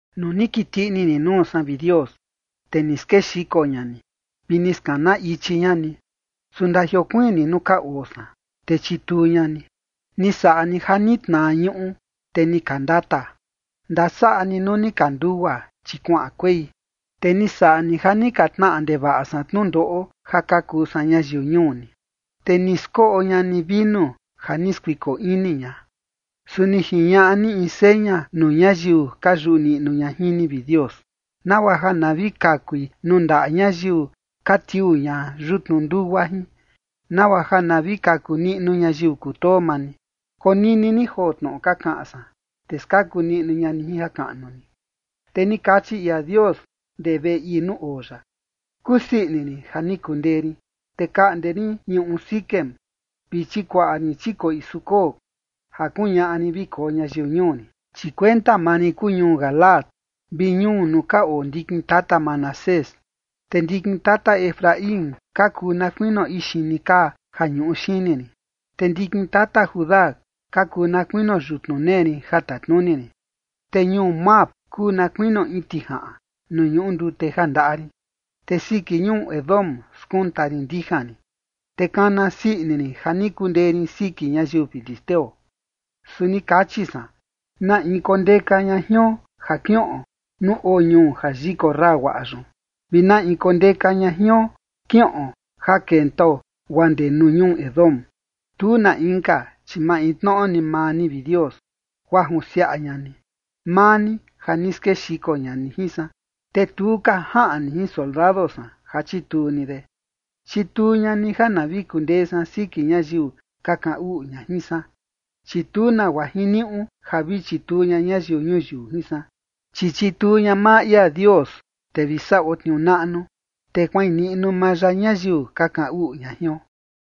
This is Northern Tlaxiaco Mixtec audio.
Nuu ni kiti ini ni nuu san, vi Dios, te ni skexiko ña ni, vi ni skana ichi ña ni, su ndajiokuiin ni nuu ka oo san, te chituu ña ni. Ni saꞌa ni ja ni tnaa ñuꞌu, te ni ka ndata. Ndasaꞌa ni nuu ni ka ndugua, chi kuaꞌan kuei. Te ni saꞌa ni ja ni ka tnaꞌa ndevaꞌa san tnundoꞌo ja ka kuu san ñayiu ñuu ni, te ni skoꞌo ña ni vinu ja ni skuiko ini ña. Su ni jiñaꞌa ni in seña nuu ñayiu ka yuꞌu niꞌnu ña jin ni, vi Dios, nagua ja na vi kakui nuu ndaꞌa ñayiu ka tiuu ña yutnu ndugua jin, nagua ja na vi kaku niꞌnu ñayiu kutoo maa ni. Konini ni joo tnoꞌo ka kaꞌan san, te skaku niꞌnu ña ni jin jakaꞌnu ni. Te ni kachi ia Dios ndee veꞌe ii nuu oo ya: “Kusii ini rin ja ni kundee rin, te kaꞌnde rin ñuꞌu Siquem vi chikuaꞌa rin chikoꞌi Sucot ja kuñaꞌa rin vi koo ñayiu ñuu rin. Chi kuenta maa rin kuu ñuu Galaad vi ñuu nuu ka oo ndikin tata Manasés, te ndikin tata Efraín ka kuu na kuinio ixini kaa ja ñuꞌu xini rin, te ndikin tata Judá ka kuu na kuinio yutnu nee rin ja tatnuni rin. Te ñuu Moab kuu na kuinio in tijaꞌan nuu ñuꞌu ndute ja ndaꞌa rin, te siki ñuu Edom skunta rin ndijan rin, te kana sii ini rin ja ni kundee rin siki ñayiu filisteo.” Su ni kachi san: “¿Na in kondeka ña jion ja kiꞌon nuu oo ñuu ja yikorra guaꞌa yun? ¿Vi na in kondeka ña jion kiꞌon ja kentao guaa ndee ñuu Edom?” Tu na inka, chi maintnoꞌo ni maa ni, vi Dios, guaa junsiaꞌa ña ni, maa ni, ja ni skexiko ña ni jin san, te tu ka jaꞌan ni jin soldado san ja chituu ni de. Chituu ña ni ja na vi kundee san siki ñayiu ka kaꞌan uꞌu ña jin san, chi tu nagua jiniuꞌu ja vi chituu ña ñayiu ñuyiu jin san. Chi chituu ña maa ia Dios, te vi saꞌo tniuu naꞌnu, te kuain niꞌnu maa ya ñayiu ka kaꞌan uꞌu ña jion.